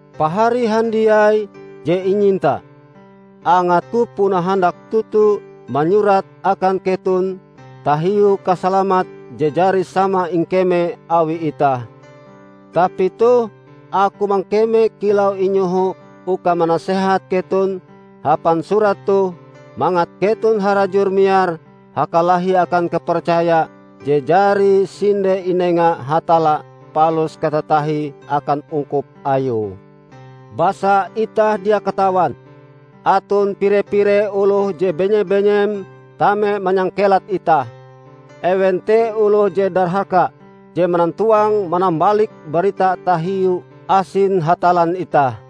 Pahari handiai je inyinta! Angatku puna handak toto manyurat akan keton tahiu kasalamat je jari sama ingkeme awi itah. Tapi toh aku mangkeme kilau inyoho uka manasehat keton hapan surat toh mangat keton harajur miar hakalahi akan kapercaya je jari sinde inenga Hatalla palus katatahie akan ungkup Ayue. Basa itah dia katawan, aton pire-pire oloh je benye-benyem tame manyangkelat itah. Ewen te oloh je darhaka je manantowang-manambalik barita tahiu asin Hatallan itah,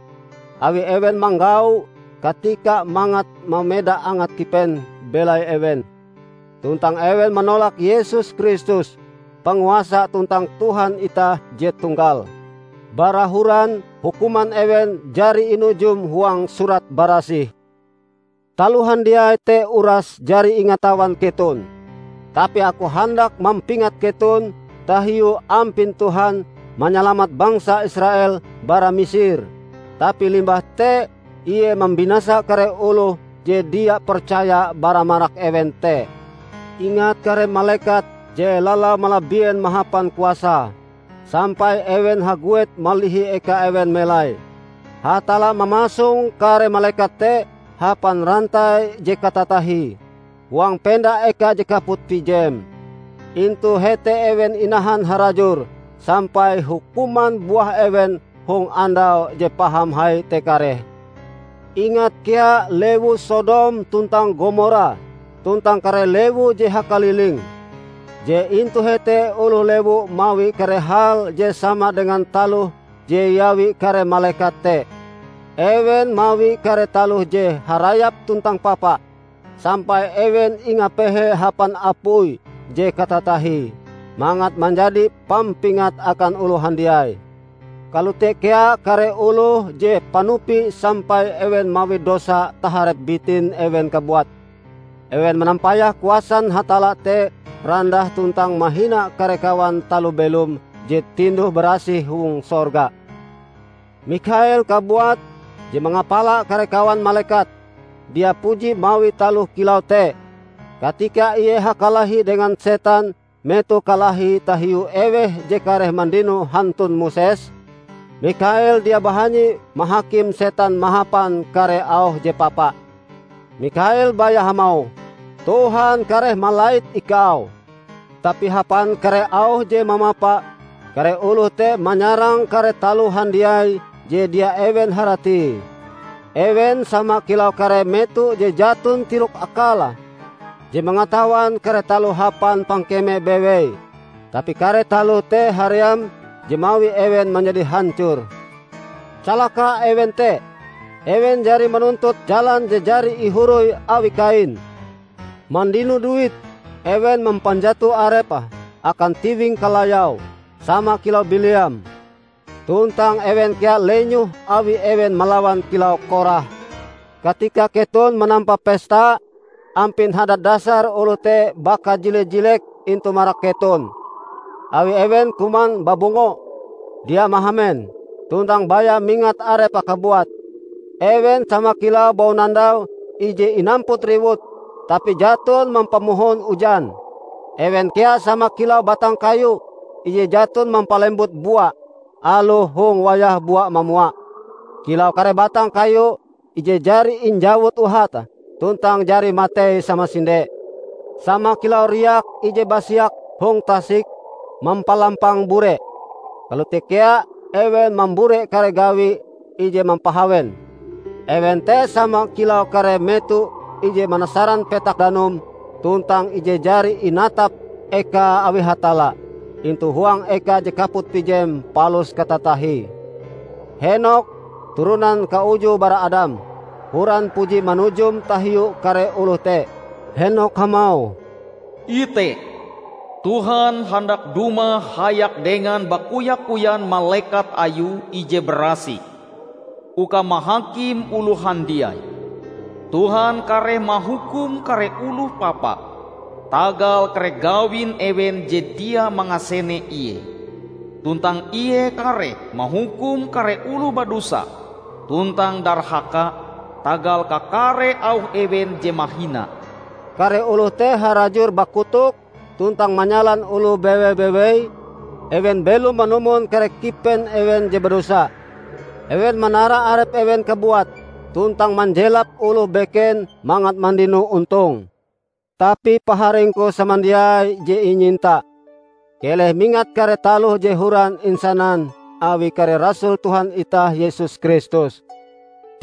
awi ewen manggau katika mangat mameda angat kipen belai ewen. Tuntang ewen manolak Yesus Kristus, Panguasa tuntang Tuhan itah je tunggal. Bara horan hukuman ewen jari inujum huang Surat Barasih. Taloh handiai te uras jari ingatawan keton. Tapi aku handak mampingat keton tahiu ampin Tuhan manyalamat bangsa Israel bara Misir, tapi limbah te Ie mambinasa kare oloh je dia percaya bara marak ewen te. Ingat kare malekat je lalau malabien mahapan kuasae, sampai ewen haguet malihi eka ewen melai. Hatalla mamasong kare malekat te hapan rantai je katatahie, huang penda eka je kaput pijem. Intu hete ewen inahan harajur sampai hukuman buah ewen hong Andau je paham hai te kareh. Ingat kea lewu Sodom tuntang Gomora tuntang kare lewu je hakaliling, je intu hete oloh lewu mawi kare hal je sama dengan taloh je iawi kare malekat te. Ewen mawi kare taloh je harayap tuntang papa, sampai ewen ingapehe hapan apui je katatahie, mangat manjadi pampingat akan oloh handiai. Kalote kea kare oloh je panupi sampai ewen mawi dosa taharep bitin ewen kabuat. Ewen manampayah kuasan Hatalla te randah tuntang mahina kare kawan taloh belom je tinduh-barasih hong sorga. Mikhael kabuat, je mangapala kare kawan malekat, dia puji mawi taloh kilau te. Katika ie hakalahi dengan setan metoh kalahi tahiu eweh je kareh mandino hantun Moses, Mikhael dia bahanyi mahakim Setan mahapan kare auh je papa. Mikhael baya hamauh, "Tuhan kareh malait ikau!" Tapi hapan kare auh je mamapa, kare oloh te manyarang kare taloh handiai je dia ewen haratie. Ewen sama kilau kare meto je jaton tirok-akale, je mangatawan kare taloh hapan pangkeme bewei. Tapi kare taloh te haream je mawi ewen manjadi hancor. Calaka ewen te! Ewen jari manuntut jalan je jari ihoroi awi Kain. Mandino duit, ewen mampanjato arepe akan tiwing kalayau, sama kilau Bileam. Tuntang ewen kea lenyoh awi ewen melawan kilau Korah. Katika keton manampa pesta, ampin hadat dasar oloh te bakajile-jilek intu marak keton. Awi ewen kuman babungo, dia mahamen, tuntang baya mingat arepe kabuat. Ewen sama kilau baunandau ije inamput riwut, tapi jaton mampamohon ujan. Ewen kea sama kilau batang kayu ije jaton mampalembut bua aloh hong wayah bua mamua; kilau kare batang kayu ije jari injawut uhate tuntang jari matei samasinde. Sama kilau riak ije basiak hong tasik mampalampang bure, kalote kea ewen mambure kare gawi ije mampahawen. Ewen te sama kilau kare meto ije manasaran petak danum tuntang ije jari inatap ekae awi Hatalla intu huang eka je kaput pijem palus katatahie. Henokh, turonan kauju bara Adam, horan puji manujum tahiu kare oloh te. Henokh hamauh "Ite, Tuhan handak dumah hayak dengan bakoya-koyan malekat Ayue ije barasih uka mahakim oloh handiai. Tuhan kareh mahukum kare oloh papa tagal kare gawin ewen je dia mangasene Ie. Tuntang Ie kareh mahukum kare oloh badosa tuntang darhaka tagal kakare auh ewen je mahina." Kare oloh te harajur bakotok tuntang manyalan oloh bewe-bewei. Ewen belom manumon kare kipen ewen je badosa. Ewen manara arep ewen kabuat, tuntang manjelap oloh beken mangat mandino ontong. Tapi Paharingku samandiai je inyinta, keleh mingat kare taloh je horan insanan awi kare rasul Tuhan itah Yesus Kristus.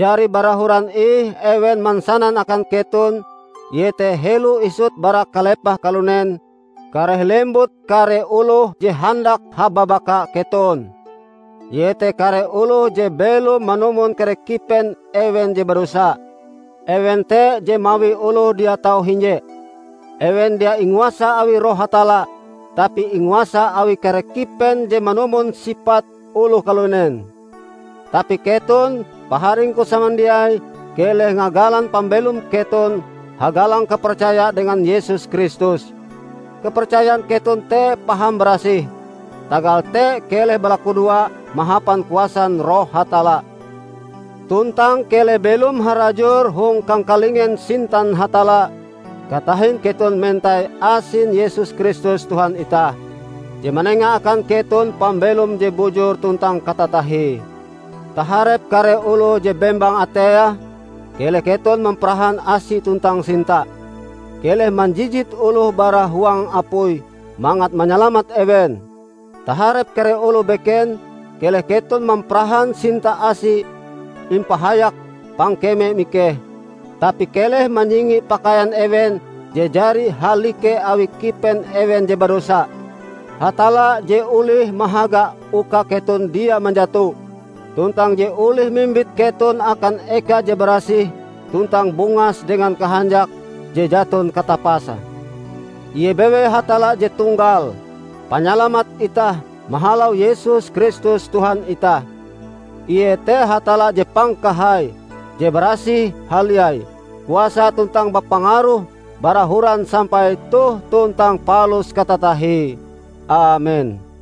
Jari bara horan ih ewen mansanan akan keton iete helo isut bara kalepah kalunen kareh lembut kare oloh je handak hababaka keton, iete kare oloh je belom manumon kare kipen ewen je badosa. Ewen te je mawi oloh dia tau hinje. Ewen dia inguasa awi Roh Hatalla tapi inguasa awi kare kipen je manumon sipat oloh kalunen. Tapi keton, paharingku samandiai keleh ngagalan pambelom keton hagalang kapercaya dengan Yesus Kristus. Kapercayan keton te paham barasih. Tagal te keleh balakudoa mahapan kuasan Roh Hatalla, tuntang keleh belom harajur hong kangkalingen sintan Hatalla katahin keton mentai asin Yesus Kristus Tuhan itah, je manenga akan keton pambelom je bujur tuntang katatahie. Taharep kare oloh je bembang ateie, keleh keton mamparahan asi tuntang sinta. Keleh manjijit oloh bara huang apui mangat manyalamat ewen. Taharep kare oloh beken keleh keton mamparahan sinta asi impahayak pangkeme mikeh, tapi keleh manyingi pakaian ewen je jari halike awi kipen ewen je badosa. Hatalla je olih mahaga uka keton dia manjato, tuntang je olih mimbit keton akan eka je barasih tuntang bungas dengan kahanjak je jaton katapase, Ie bewei Hatalla je tunggal, Panyalamat itah mahalau Yesus Kristus Tuhan itah. Ie te Hatalla je pangkahai, je barasih haliai, kuasa tuntang bapangaruh bara horan sampai toh tuntang palus katatahie! Amen.